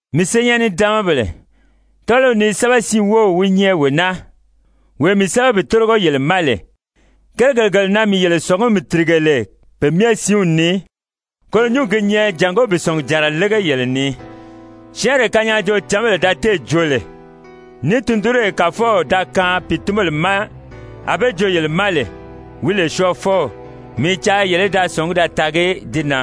Mii syɛɛn-nidaanmabèle, tɔ́ɔliw ni sɛ́bɛsiin wów wi nyɛ wee naa, wee mii sɛ́bɛ bi tórigo yele ma lè. Kérigèle gele na mii yele sɔ̀ngumi tìrige lè pe myɛ siinw ni, koro nyúngi gi nyɛ jàngó bi sɔ̀ngujànra lége yele ni. Syɛ́ɛnree kanyaajoocǎnbèle da téè joo lè, ní tundunree Kàfɔw da kaan pìitunbèle ma a be di joo yele ma lè, wi lè Syɔɔfɔw, mii i caa yele í da sɔ̀ngí da taagi di na.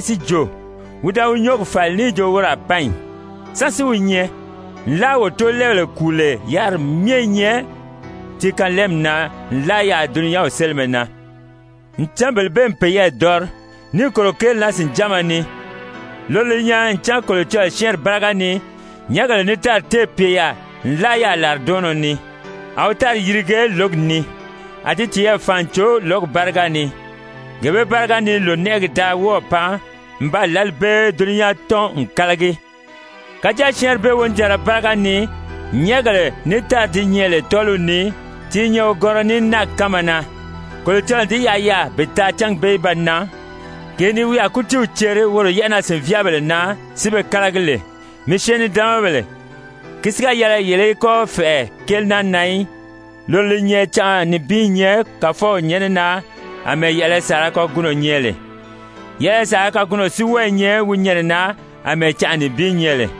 si jo: «Wi da wi nyɔ́ɔgi fàli níì jo woro a pan ì? Sán si wi nyɛ? Nlaa wo tóolɛɛbèle kùu lè yáriri myɛ i nyɛ ti kanlɛɛmi na nlaa yaà dulunyanw sélimɛ na.» Ncan bele bee n peyɛɛ dɔri, níì kòro kéeli naa sìnjánma ni, loro li nyɛ ncan Kolocɔlɔɔ syɛ́ɛnri báriga ni nyɛ̀ʔɛgèle ní tári téè pye yaà nlaa yaà làridɔɔnnɔ ni, a wi tári yirige lǒgi ni, a di tiyɛɛ fàan n cò lǒgi báriga ni. Gee bee báriga ni lònɛʔɛgi da wɔ́ɔ̀ pan n baa lǎli bee dulunyan tɔ́n n kálagi. Kàjáa syɛ́ɛnri bee wonijanra báriga ni nyɛ̀ʔɛgèle ní tári di nyɛ lè tɔ́ɔliw ni, ti i nyɛ wogɔnrɔ ní náagi kánma na, Kolocɔlɔɔ n di yaʔa yaà bi taa cángi bee í ba nan, gee ni wi a kútiiw ceri woro yɛ́ʔɛnaa-sìnvyaabèle na si be kálagi lè. Mii syɛɛn-nidaanmabèle, ki si ga yɛlɛ yele í kɔ́ fɛ̀ʔɛ kéeli naa na í, loro li nyɛ canʔa nibin i nyɛ Kàfɔw nyɛ́nɛ na àmɛɛ yɛ̀ʔɛlɛ saala kagunɔ nyɛ lè, yɛ̀ʔɛlɛ saala kagunɔ si wɔ́ɔ i nyɛ wi nyɛnɛ na àmɛɛ canʔa nibin nyɛ lè.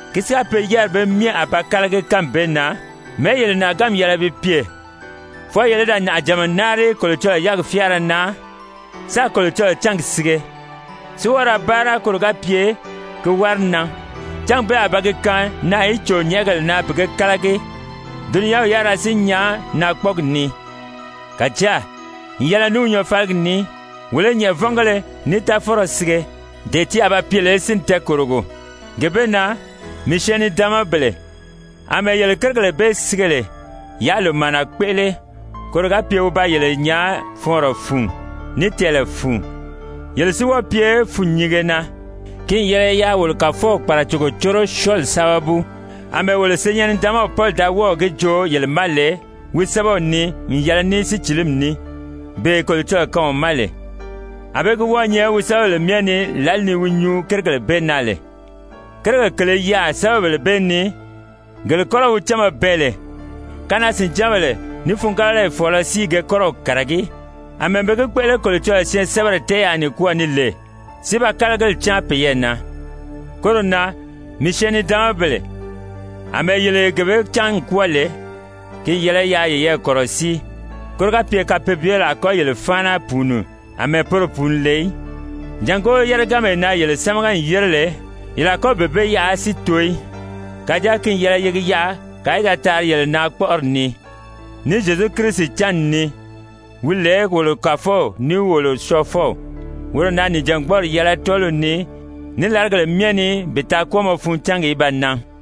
Ki si ga pye yáriri bee myɛ a ba kálagi kánmi bee na, mɛ̀ɛ́ yele nàʔaganmi yɛlɛ bi pye? Fwɔɔ yele í da nàʔajànma náari Kolocɔlɔɔ yɛ́ɛgi fyáara na, sáā Kolocɔlɔɔ cángi sige, si wɔ́ɔ ra báara koro ga pye ki wári nan, cángi bee a ba gi kaan naà í cò nyɛ̀ʔɛgèle na bi ge kálagi, dulunyanw yárira si nyan naakpɔɔgi ni. Kàjáa, n yɛlɛ ní wi nyɔɔfaligi ní, wolo i nyɛ̀ʔɛvɔngéle ní táfɔnrɔ sige, dee ti a ba pye lè sínni tɛɛkòrogo. Gee bee na, mii syɛɛn-nidaanmabèle, àmɛɛ yele kérigèle bee sige lè, yaa lòmaana kpéʔele, koro ga pye wi ba yele nyaa fɔɔnrɔ fun, ní tɛɛlɛ fun, yele si wɔ́ɔ pye fûnnyinge na. Ki n yɛlɛ yaa wolo Kàfɔw kpàracogo córo syɔɔli sábabu, àmɛɛ wolo senyɛn-nidaanmaw Pɔli da wɔ́ɔ̀ gi joo yele ma lè wi sɛ́bɛw ni n yɛlɛ ní sícilimi ní, bee Kolocɔlɔɔ kaan wi ma lè. Anbée gi wɔ́ɔ̄ nyɛ wi sɛ́bɛbèle myɛ ni lǎli ni wi nyuu kérigèle bee na lè, kérigèle kèle i yaà sɛ́bɛbèle bee ni, gele kɔ́rɔ wi cánma bɛɛn lè, kanaa-sìnjánbèle ní fûngabalayi fɔ̀ɔlɔ si i ge kɔ́rɔw kàragí, àmɛɛ be gi kpéʔele Kolocɔlɔɔ syɛɛnsɛbɛri tɛ́ɛyaa nikwɔɔ ni lè, si ba kálagili cáan peyɛɛ na. Koro na, mii syɛɛn-nidaanmabèle, àmɛɛ yele gee bee cán n kwɔ́ɔ lè, ki n yɛlɛ yaa yeyɛɛ kɔ̀rɔsíi, koro ga pye kapeebyebèle a kɔ́ yele fáana pùuni àmɛɛ poro pùuni lè í, jàngó yéreganmee na yele sámaga n yére lè, yele a kɔ́ bee bee yaʔa si too í. Kàjáa ki n yɛlɛ ye gi yaʔa kàa í da taari yele na kpɔ́ʔɔri ni, ní Zyezu Kirisi cánni ni, wi lè wolo Kàfɔw ní wolo Syɔɔfɔw. Woro na nìjangbɔɔri yɛlɛ tɔ́ɔliw ni, ní làrigèle myɛ ni bi taa kwɔ́ɔmɔ fun cángi í ba nan!